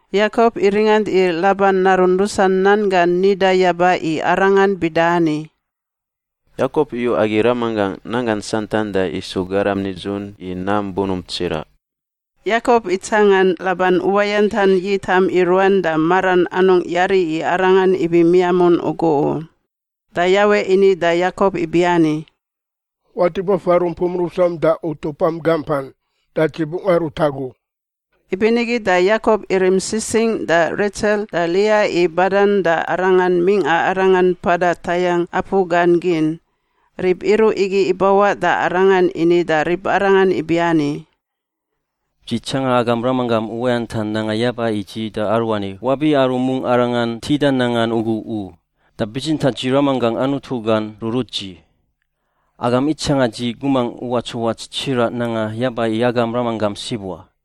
Yakop iringant i Laban narun rusan nan gan nida yaba i arangan bida ani, “Yakop iyu agi ramanggangꞌ nanggan santan da isu garam nidzun i nam bunump tsiraꞌ.” Yakop itsangan Laban uwayantan yitam i ruan da maran anungꞌ yari i arangan ibi miamun ugu u. Da Yawe ini da Yakop ibiani, “Watip wafa rumpum rusam da utupam gampan. Da Dzi bungꞌ arut agu.” Ibinigi da Yakop irim sisingꞌ da Retsel da Lia i badan da arangan mingꞌa arangan mpada tayangꞌ apu gan gin. Rib iruꞌ igi ibawaꞌ da arangan ini da ribarangan ibiani, “Dzi tsanga agam ramanggam uwayantan nanga yaba i dzi da aruani wabi aru mungꞌ arangan tida nangan ugu u, da bitsintaꞌ dzi ramanggangꞌ Anutu gan rurut dzi. Agam itsanga dzi gumangꞌ uwats uwats tsiraꞌ nanga yaba i agam ramanggam sib wa,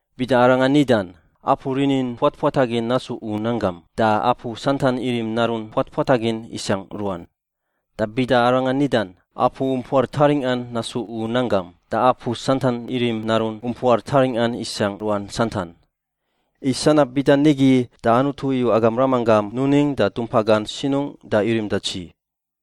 Bida arangan nidan, ‘Apu rinin puatpuatagin nasu u nanggam,’ da apu santan irim narun puatpuatagin isangꞌ ruan. Da bida arangan nidan, ‘Apu umpuar taringꞌan nasu u nanggam,’ da apu santan irim narun umpuar taringꞌan isangꞌ ruan santan. I sanab bida nigi da Anutu iyu agam ramanggam nuning da dumpa gan sinungꞌ da irim da dzi.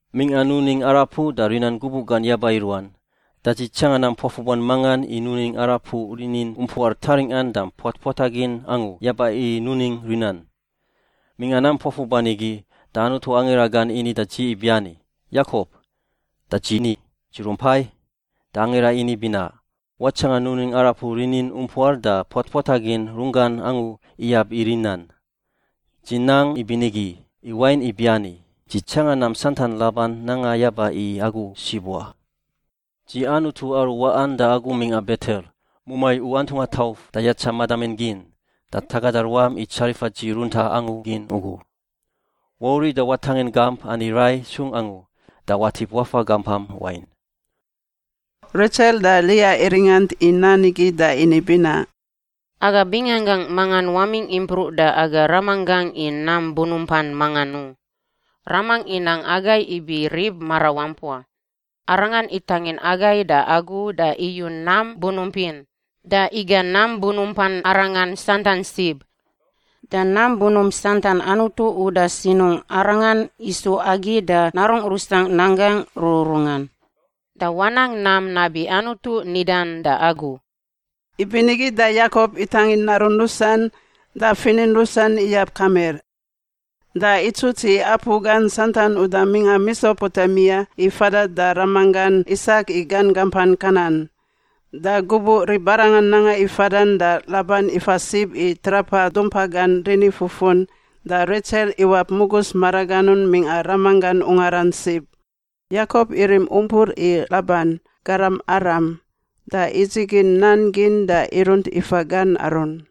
“Mingꞌa nuning arapuꞌ da rinan gubuꞌ gan yaba i ruan, da dzi tsanga nam puafuban mangan i nuning arapuꞌ rinin umpuar taringꞌan da puatpuatagin angu yaba i nuning rinan. Mingꞌa nam puafuban igi da Anutu angira gan ini da dzi ibiani, ‘Yakop.’ Da dzi ni, ‘Dzi rumpai.’ Da angira ini binaꞌ, ‘Watsangan nuning arapuꞌ rinin umpuar da puatpuatagin runggan angu iyab i rinan. Dzi nang ibinigi, i wain ibiani, dzi tsangan nam santan Laban nanga yaba i agu sib wa. Dzi Anutu aru waꞌan da agu mingꞌa Betel, mumai u antungꞌa tauf da yatsa madamin gin da tagada ruam i tsarifa dzi runtaꞌ angu gin ugu. Wauriꞌ da watangin gamp ani rai sung angu da watip wafa gampam wain.’” Retsel da Lia iringant i nan igi da ini binaꞌ, “Aga binganggangꞌ mangan wamingꞌ impruꞌ da aga ramanggangꞌ i nam bunumpan mangan u. Ramangꞌ inang agai ibi rib marawampua. Arangan itangin agai da agu da iyu nam bunump in da iga nam bunumpan arangan santan sib. Da nam bunump santan Anutu uda sinungꞌ arangan isu agi da narungꞌ rusangꞌ nanggangꞌ rururungan. Da wanang nam nabi Anutu nidan da agu.” Ibinigi da Yakop itangin narun rusan da finin rusan iyab kamir, da itsuts i apu gan santan uda mingꞌa Mesopotemia i fada da ramanggan Isak i gan gampan Kanan. Da gubuꞌ ribarangan nanga i fadan da Laban ifa sib i trapa dumpa gan rinifufun da Retsel iwap mugus maraganun mingꞌa ramanggan ungaran sib. Yakop irim umpur i Laban, garam Aram, da idzigin nan gin da irunt ifa gan arun.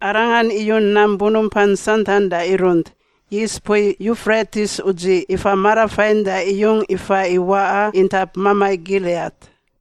Arangan iyu nam bunumpan santan da irunt, yis mpui Yufretis udziꞌ ifa marafain da iyung ifa i waꞌa intap mamai Giliat.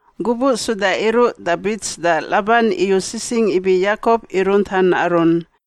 Gubuꞌ suda iruꞌ da bits da Laban iyu sisingꞌ ibi Yakop irunt an arun.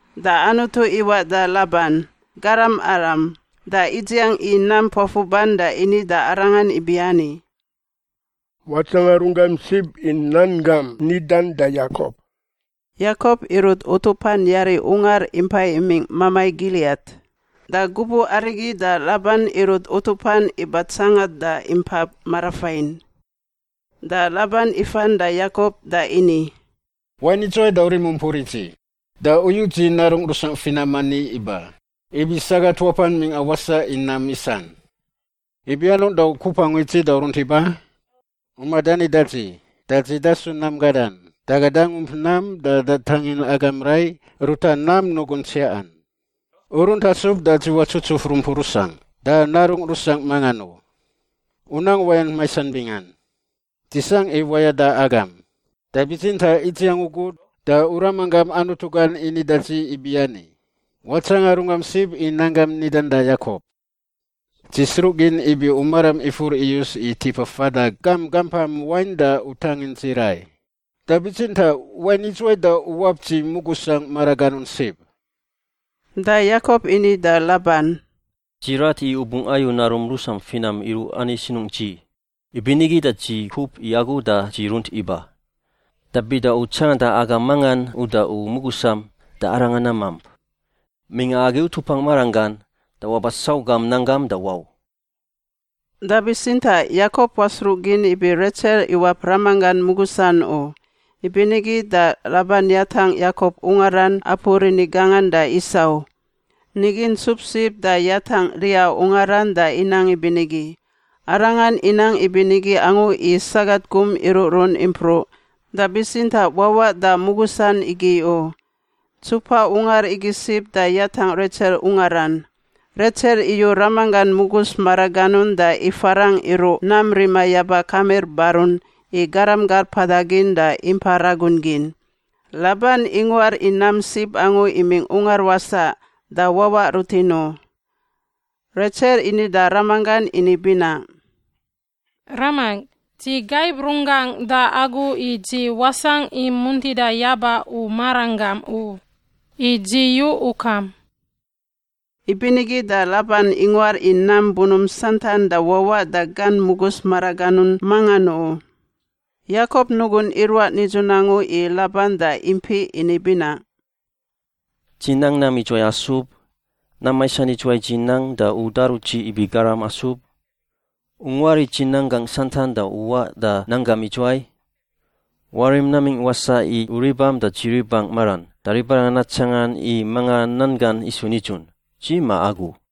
Da Anutu iwaꞌ da Laban (garam Aram) da idziang i nam puafuban da ini da arangan ibiani, “Watsanga runggam sib i nan gam nidan da Yakop.” Yakop irut utupan yari ungar impai imingꞌ mamai Giliat, da gubuꞌ arigi da Laban irut utupan iba tsangan da impa marafain. Da Laban ifan da Yakop da ini, “Wain idzuwai da u rim umpur i dzi da u yu dzi narungꞌ rusangꞌ finam ani iba ibi sagat wapan mingꞌa wasaꞌ i nam isan? Ibi anungꞌ da u kup angu i dzi da u runt iba? U madani da dzi da dzi dasu nam gadan da aga dangump nam da datangin agam rai ruta nam nugun tsiaꞌan. U runt asub da dzi watsutsuf rumpungꞌ rusangꞌ da narungꞌ rusangꞌ mangan u. U nang uwayant maisan bingan. Dzi sangꞌ i wayada agam, da bitsintaꞌ idziang ugu da u ramanggam Anutu gan ini da dzi ibiani, ‘Watsanga runggam sib i nan gam nidan da Yakop.’ Dzi sruꞌgin ibi u maram ifur iyus i tipa fada gam gampam wain da u tangin dzi rai. Da bitsintaꞌ wain idzuwai da u wap dzi mugusangꞌ maraganun sib?” Da Yakop ini da Laban, “Dzi rat i u bungꞌ ayu narum rusam finam iruꞌ ani sinungꞌ dzi, ibinigi da dzi kup i agu da dzi runt iba. Da bida u tsanganda aga mangan uda u mugusam da arangan namamp. Mingꞌa agi utupangꞌ maranggan, da waba sau gam nanggam da wau.” Da bitsintaꞌ Yakop wasruꞌgin ibi Retsel iwap ramanggan mugusan u. Ibinigi da Laban yatangꞌ Yakop ungaran apu rini gangan da isau. Nigi ntsup sib da yatangꞌ Lia ungaran da inang ibinigi. Arangan inang ibinigi angu i sagat gum iruꞌrun impruꞌ, da bitsintaꞌ wawaꞌ da mugusan igi u. Ntsupa ungar igi sib da yatangꞌ Retsel ungaran. Retsel iyu ramanggan mugus maraganun da ifarangꞌ iruꞌ nam rima yaba kamir barun i garam gar mpada gin da impa ragun gin. Laban inguar i nam sib angu imingꞌ ungar wasaꞌ da wawaꞌ rutin u. Retsel ini da ramanggan ini binaꞌ, “Ramangꞌ, dzi gaib runggangꞌ da agu i dzi wasangꞌ i muntida yaba u maranggam u. I dzi yu ukam.” Ibinigi da Laban inguar i nam bunump santan da wawaꞌ da gan mugus maraganun mangan u. Yakop nugun iruaꞌ nidzun angu i Laban da impiꞌ ini binaꞌ, “Dzi nang nam idzuwai asub? Nam maisan idzuwai dzi nang da u daru dzi ibi garam asub? U nguar i dzi nanggangꞌ santan da u waꞌ da nanggam idzuwai? Warim namingꞌ wasaꞌ i u ribam da dzi ribangꞌ maran da ribarangan natsangan i mangan nan gan isu nidzun, dzi ma agu.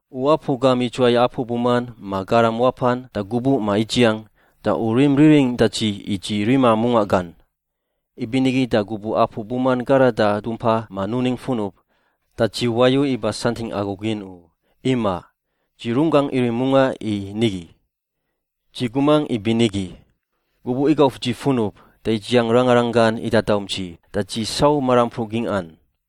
U apu gam idzuwai apu buman ma garam wapan da gubuꞌ ma idziang, da u rim riringꞌ da dzi i dzi rima mungaꞌ gan. Ibinigi da gubuꞌ apu buman garada dumpa ma nuning funub, da dzi wayu iba santingꞌ agu gin u; imaꞌ. Dzi runggangꞌ irim mungaꞌ i nigi. Dzi gumangꞌ ibinigi: gubuꞌ igauf dzi funub da idziang rangarang gan idadaum dzi da dzi sau marampruꞌ gingꞌan.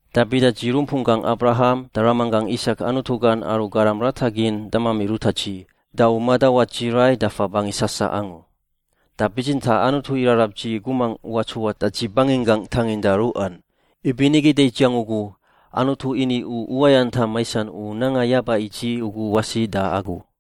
Da bida dzi rumpunggangꞌ Abraham da ramanggangꞌ Isak Anutu gan aru garam rata gin damami ruta dzi, da u madawat dzi rai dafa bangi sasaꞌ angu. Da bitsintaꞌ Anutu irarab dzi gumangꞌ uwats uwats da dzi banginggangꞌ tanginda ruꞌan, ibinigi da idziang ugu Anutu ini u uwayantam maisan u nanga yaba i dzi ugu wasi da agu.”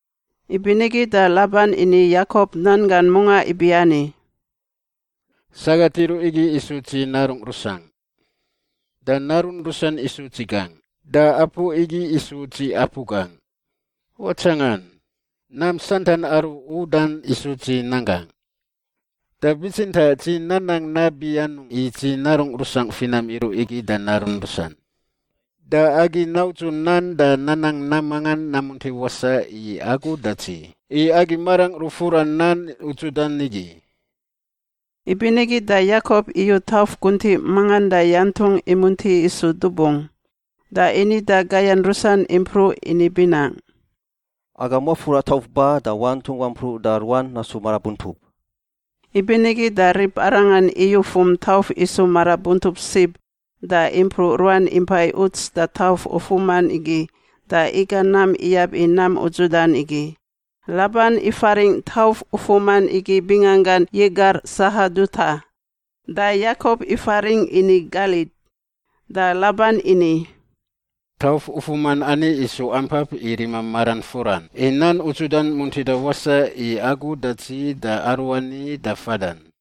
Ibinigi da Laban ini Yakop nan gan mungaꞌ ibiani, “Sagat iruꞌ igi isu dzi narungꞌ rusangꞌ. Da narun rusan isu dzi gangꞌ, da apu igi isu dzi apu gangꞌ. Watsangan! Nam santan aru u udan igi isu dzi nanggangꞌ. Da bitsintaꞌ dzi nanang nabi anungꞌ i dzi narungꞌ rusangꞌ finam iruꞌ igi da narun rusan? Da agi naudzu nan da nanang nam mangan namunti wasaꞌ i agu da dzi i agi marangꞌ rufura nan udzudan igi.” Ibinigi da Yakop iyu tauf guntiꞌ mangan da yantungꞌ imunti isu dubung. Da ini da gayan rusan impruꞌ ini binaꞌ, “Agam wafura i tauf ba da wantungꞌ wampruꞌ da ruan nasu marabuntup.” Ibinigi da ribarangan iyufum tauf isu marabuntup sib da impruꞌ ruan impai uts da tauf ufuman igi da iga nam iyab i nam udzudan igi. Laban ifaringꞌ tauf ufuman igi binganggan Yegar Sahaduta, da Yakop ifaringꞌ ini Galid. Da Laban ini, “Tauf ufuman ani isu ampap i rima maran furan i nan udzudan muntida wasaꞌ i agu da dzi da aruani da fadan.”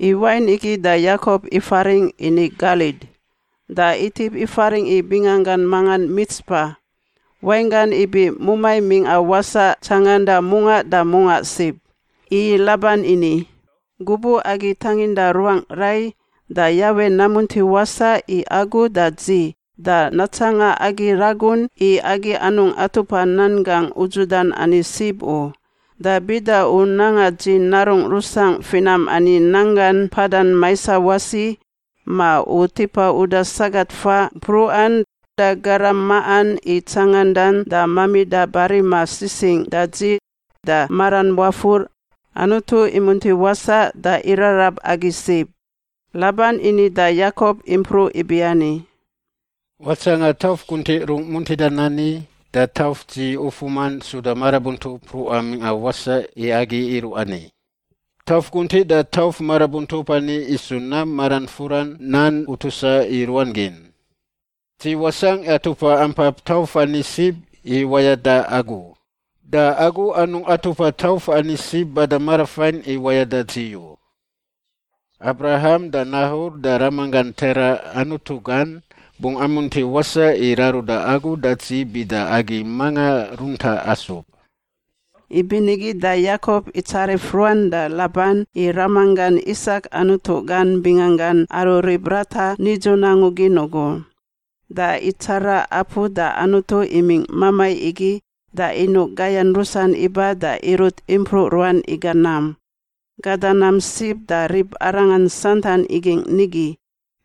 I wain igi da Yakop ifaringꞌ ini Galid. Da itip ifaringꞌ i binganggan mangan Mitspa (wainggan ibi mumai mingꞌa wasaꞌ tsanganda mungaꞌ da mungꞌa sib), i Laban ini, “Gubuꞌ agi tanginda ruangꞌ rai da Yawe namunti wasaꞌ i agu da dzi da natsanga agi ragun i agi anungꞌ atupa nan gangꞌ udzudan ani sib u. Da bida u nanga dzi narungꞌ rusangꞌ finam ani nanggan mpadan maisa wasi ma u tipa uda sagat faꞌ mpruꞌan da garam maꞌan i tsangandan da mamida barima sisingꞌ da dzi da maram wafur, Anutu imunti wasaꞌ da irarab agi sib.” Laban ini da Yakop impruꞌ ibiani, “Watsangan tauf guntiꞌ rung muntidan ani da tauf dzi ufuman suda marabuntup mpruꞌan mingꞌa wasaꞌ i agi iruꞌ ani. Tauf guntiꞌ da tauf marabuntup ani isu nam maran furan nan utusa i ruan gin. Dzi wasangꞌ atupa ampap tauf ani sib i wayada agu u, da agu anungꞌ atupa tauf ani sib bada marafain i wayada dzi u. Abraham da Nahor da ramanggan Tera Anutu gan bungꞌ amunti wasaꞌ i raruda agu da dzi bida agi manga runta asub.” Ibinigi da Yakop itsarif ruan da Laban i ramanggan Isak Anutu gan binganggan aru rib rata nidzun angu gin ugu. Da itsara apu da Anutu imingꞌ mamai igi da inuꞌ gayan rusan iba da irut impruꞌ ruan iga nam. Gada nam sib da ribarangan santan igingꞌ nigi.